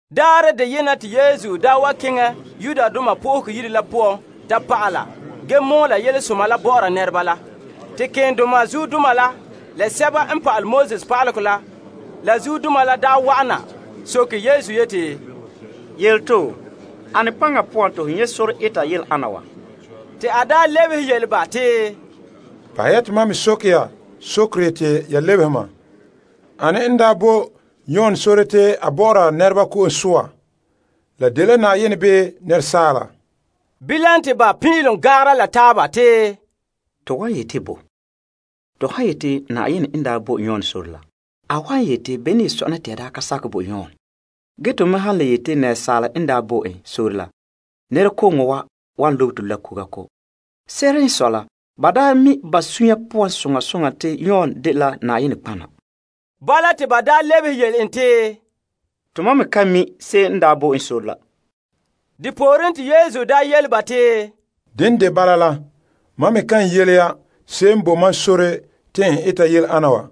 Daarɛ deyena te Yesu daa wa keŋɛ Yenɛ Yire la poan ta pa'ala ge mɔɔla Yelesoma la bɔ'ɔra nɛreba la. Te keendoma zuodoma la, la pa'alegɔ pa'aleba la, la zuodoma la wa'ana na soke Yesu yeti, Yele to, ane paŋa poan te ho nyɛ' sore eta yele ana wa? Te a lebehe yele ba te, Bahɛ ya te mam me soke ya sokere te ya lebehe mam. Ane n daa bo Yon sore te a bɔ'ɔra nɛreba ko'om soa? La daa dela Na'ayenɛ bii asaala? Bilam te ba pin'ilom gan'angere la taaba te, To wan yete bo? To han yete Na'ayenɛ n daa bo Yon sore la, a wan yete bene n ye sɔna te to daa ka sakɛ bo Yon? Ge to me han le yete asaala n daa bo en sore la, nɛrekooŋɔ wa wan lobe to la kuga ko'. Se'ere n sɔe la, ba mi' ba sunya poan soŋa soŋa te Yon daa dela nɔtɔgɔha. Bala te ba lebehe yele en te, To mam ka mi' se'em n daa bo en la. Depooren te Yesu yele ba te, Dene de bala la, mam me ye kan yele ya se'em n bo mam sore te n eta yele ana wa.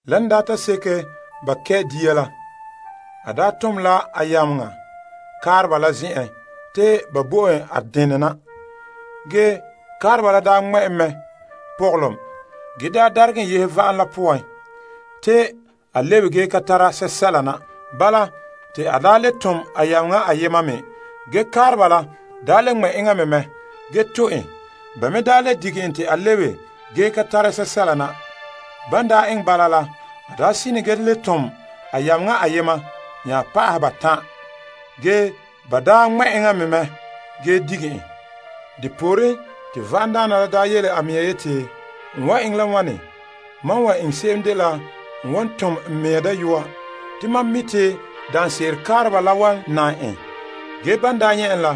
Lan daa ta seke ba kɛ' dia la, a daa tom la a yameŋa kaareba la zen'en te ba bo en a denɛ na. Ge kaareba la daa ŋmɛ' en mɛ pɔgɔlom ge daa daregɛ en yehe va'am poan te a lebe ge ka tara sɛla na. Bala, te a daa le tom a yameŋa ayema me. Ge kaareba la daa le ŋmɛ' enŋa me mɛ ge tu' en. Ba me daa le dige en te a lebena ge ka tara sɛla na. Ban daa eŋɛ bala la, a daa sine ge le tom la a yameŋa ayema nya pa'aha batan'. Ge ba daa ŋmɛ' en mɛ ge dige en. Depooren te va'amdaana la daa yele a mea yeti, N wan eŋɛ la wane? Mam wan eŋɛ se'em dela n wan tom n mea dayɔba'arɛ. Te mam mi' te daanse'ere kaareba la wan nan en. Ge ban daa nyɛ' en la,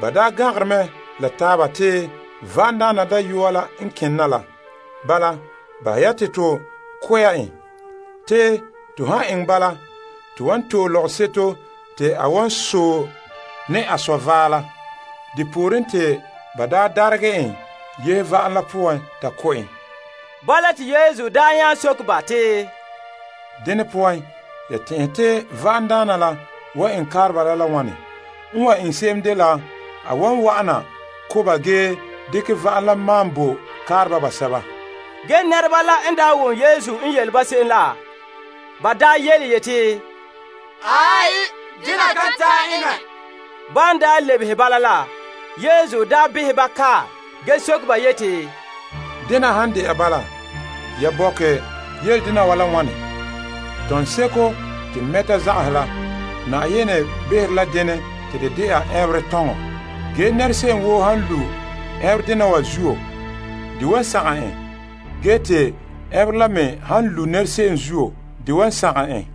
ba daa gan'angere mɛ la taaba te, Va'amdaana dayɔa la n kene na la. Bala, bahɛ ya te to ko' ya en. Te to han eŋɛ bala, to wan to'e lɔgɔseto te a wan sɔe ne a zɔ' vaɛ la. Depooren te ba daa daregɛ en yehe va'am la poan ta ko' en. Bala te Yesu daa nya soke ba te, Dene poan, ya tɛn'ɛhe te va'amdaana la wan eŋɛ kaareba la la wane? N wan eŋɛ se'em dela, a wan wa'ana ko' ba ge dekɛ va'am la maan bo kaareba basɛba. Ge nɛreba la n daa wom Yesu n yele se'em la, ba daa yeti, Aai, dena kan ta'an eŋɛ. Ban daa lebehe bala la, Yesu behɛ ba kae ge soke ba yeti, Dena han de'a bala, ya bɔkɛ yele dena wa la wane? Kuguse'ere te mɛteba zagahɛ la, denɛ en ta dɛna ɛnberɛ kugure. Ge nɛra se'em woo han lu' kugure dena wa zuo, de wan sagom en. Ge te kugure la me han lu' se'em zuo, de wan sagom en.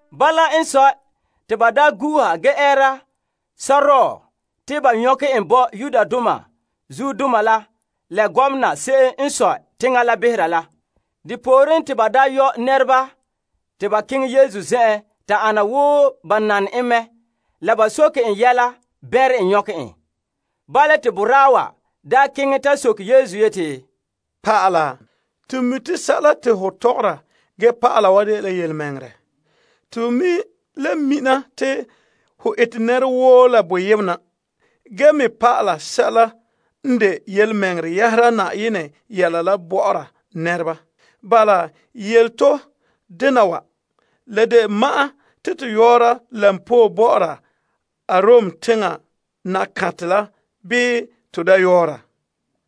Bala n sɔe, te ba gu'uha ge ɛɛra sɔrɔɔ te ba nyɔkɛ en bo zuodaana se'em n sɔe teŋa la behera la. Depooren te ba yɔ' nɛreba te ba keŋɛ Yesu zen'en ta ana wo ba nane en mɛ la ba soke en yɛla bɛnrɛ nyɔkɛ en. Bala te boraa wa keŋɛ ta soke Yesu yeti, Pa'ala, to mi' te sɛla te ho tɔgɔra ge pa'ala wa dela yelemɛŋɛrɛ. To me le mina te ho ete nɛra woo la boyena ge me pa'ala sɛla n de yelemɛŋɛrɛ yɛhera Na'ayenɛ yɛla bɔ'ɔra nɛreba. Bala, yele to dena wa. La de ma'an te to yɔ'ɔra koba bɔ'ɔra Kaesar la bii to daa yɔɔra?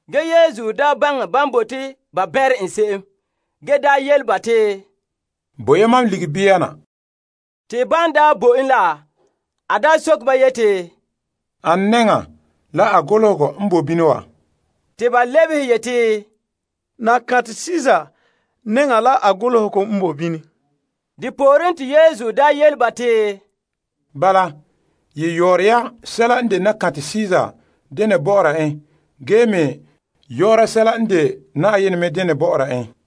Ge Yesu baŋɛ ban bote ba bɛnrɛ en se'em ge daa yele ba te, Bo' ya mam ligikɔnberɛ na. Te ban daa bo en la, a daa soke ba yeti, Ane nɛŋa la a golehegɔ n boe bini wa? Te ba lebehe yeti, Kaesar nɛŋa la a golehegɔ n boe bini. Depooren te Yesu yele ba te, Bala, ye yɔɔra ya sɛla n de Kaesar denɛ bɔ'ɔra en ge me yɔɔra sɛla n de Na'ayenɛ me denɛ bɔ'ɔra en.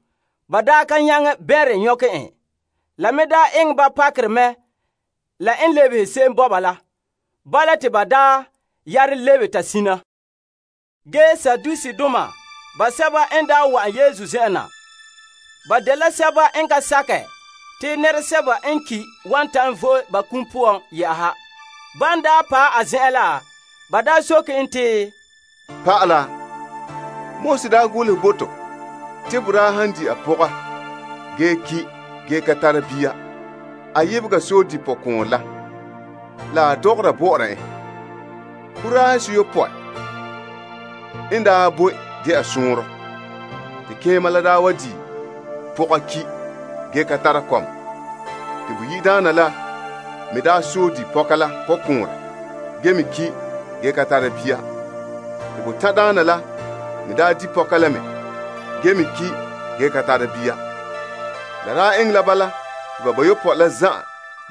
Ba ka nyaŋɛ bɛnrɛ nyɔkɛ en. La me eŋɛ ba pakerɛ mɛ la n lebehe se'em bo ba la. Bala te ba yare lebe ta sina. Ge Saduseedoma basɛba n wa'an Yesu zen'en na. Ba dela sɛba n ka sakɛ te nɛresɛba n ki' wan ta'an vo'e ba kum poan yɛ'ɛha. Ban daa paɛ a zen'en la, ba soke en te, Pa'ala, Moses daa golehɛ bo to te boraa han di' a pɔga ge ki' ge ka tara bia, a yebega sɔe di' pɔkɔɔnrɛ la la a dɔgɔra bɔ'ɔra en. Boraahe seyopɔe n daa boe dɛna sɔɔnrɔ. Te keema la daa wa di' pɔga ki' ge ka tara kɔma. Te boyi'daana la me daa sɔe di' pɔka la pɔkɔɔnrɛ ge me ki' ge ka tara bia. Te botan' daana la me daa di' pɔka la mɛ ge me ki' ge ka tara bia. La daa eŋɛ la bala te bayopɔe la zan'an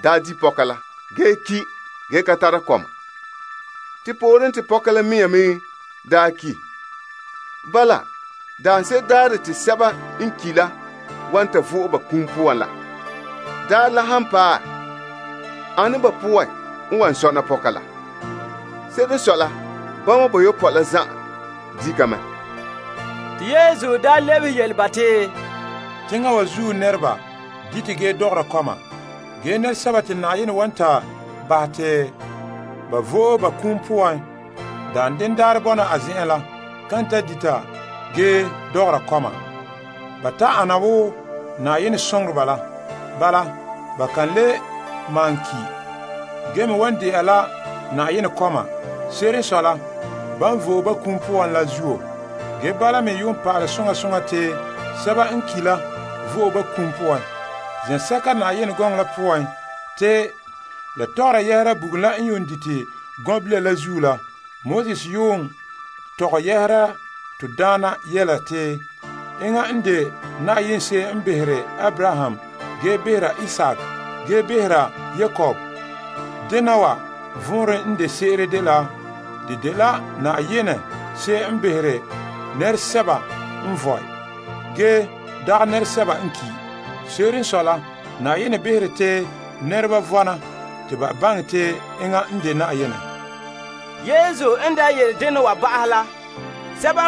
daa di' pɔka la ge ki' ge ka tara kɔma. Te pooren, te pɔka la mea me daa ki'. Bala, daanse'ere daarɛ te sɛba n ki' la wan ta vo'e ba kum poan la daarɛ han paɛ, ane ba poan n wan sɔna pɔka la? Se'ere n sɔe la, bama bayopɔe la zan'an di' ka mɛ. Te Yesu lebehe yele ba te, Teŋa wa zuo nɛreba dite ge dɔgɔra kɔma. Ge nɛresɛba te Na'ayenɛ wan ta bahɛ ba ta ba vo'e ba kum poan daanden daarɛ bɔna a zen'en la, kan ta dita ge dɔgɔra kɔma. Ba ta ana wo Na'ayenɛ soŋoreba la. Bala ba kan le malom ki', ge me wan de'a la Na'ayenɛ kɔma. Se'ere n sɔe la, ban vo'e ba kum poan la zuo. Ge bala me yuun pa'ale soŋa soŋa te sɛba n ki' la vo'e ba kum poan. Zen'sɛka Yenɛ gɔŋɔ la poan te la tɔgɔra yɛhera bugum la n yuun dite tia la zuo la, Moses yuun tɔgɛ yɛhera to Daana yele te, Enŋa n de Na'ayenɛ se'em n behere Abraham ge behera Isaak, ge behera Yakob. Dena wa vɔnrɛ n de se'ere dela a dela Na'ayenɛ se'em n behere nɛresɛba n vɔe, ge dagɛ nɛresɛba n ki'. Se'ere n sɔe la, Na'ayenɛ bahere te nɛreba vɔna te ba baŋɛ te enŋa n de Na'ayenɛ. Yesu n daa yele dena wa ba'ahɛ la,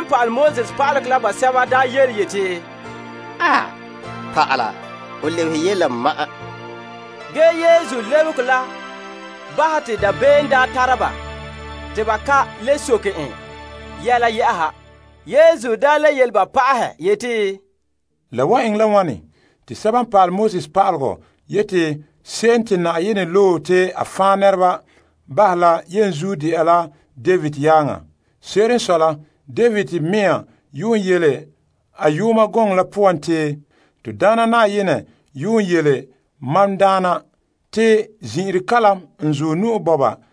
pa'alegɔ pa'aleba la basɛba yeti, Pa'ala, ho lebehe yele la ma'an. Ge Yesu lebehegɔ la bahɛ te dabeem tara ba te ba ka le soke en yɛla yɛ'ɛha. Yesu le yele ba pa'ahɛ yeti, La wan eŋɛ la wane te pa'alegɔ pa'aleba yete se'em te Yenɛ loe la yenzuo dɛna la David yaaŋa? Se'ere n sɔe la, David mea yuun yele a Yooma Gɔŋɔ la poan te, Te Na'ayenɛ yele mam Daana la yeti, Zin'ire n zuɔ nu'o wa na,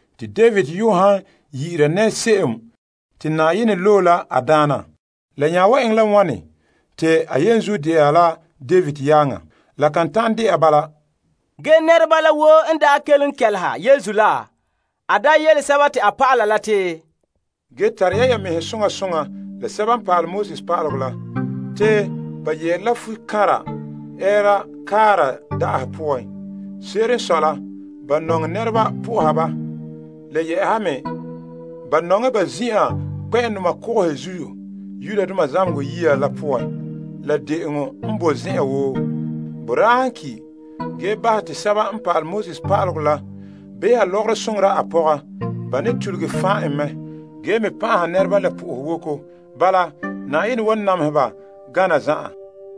Te David yuun han yi'ira nɛra se'em te Na'ayenɛ loe la a Daana, la nya wan eŋɛ la wane te a yenzuo dɛna la David yaaŋa? La kan ta'an de'a bala. Ge nɛreba la woo n kelom kɛleha Yesu la, a yele a dɔlɔba la te, Ge tare ya ya mɛhe soŋa soŋa la pa'alegɔ pa'aleba la. Te ba yɛɛre la fukanra ɛɛra kaara da'ahe poan. Se'ere n sɔe la, ba nɔŋɛ nɛreba po'oha ba. Le yɛ'ɛha me, ba nɔŋɛ ba zin'an kpɛ'ɛndoma kogohe zuo zamehegɔ yiya la poan la de'eŋɔ n boe zen'an woo. Boraa han ki' ge bahɛ te pa'alegɔ pa'aleba la beha lɔgɔrɔ ge soŋora a pɔga, ba ne tuluge fan' en mɛ ge me pan'aha nɛreba la po'ohowoko. Bala, Na'ayenɛ wan namehe ba gana zan'an.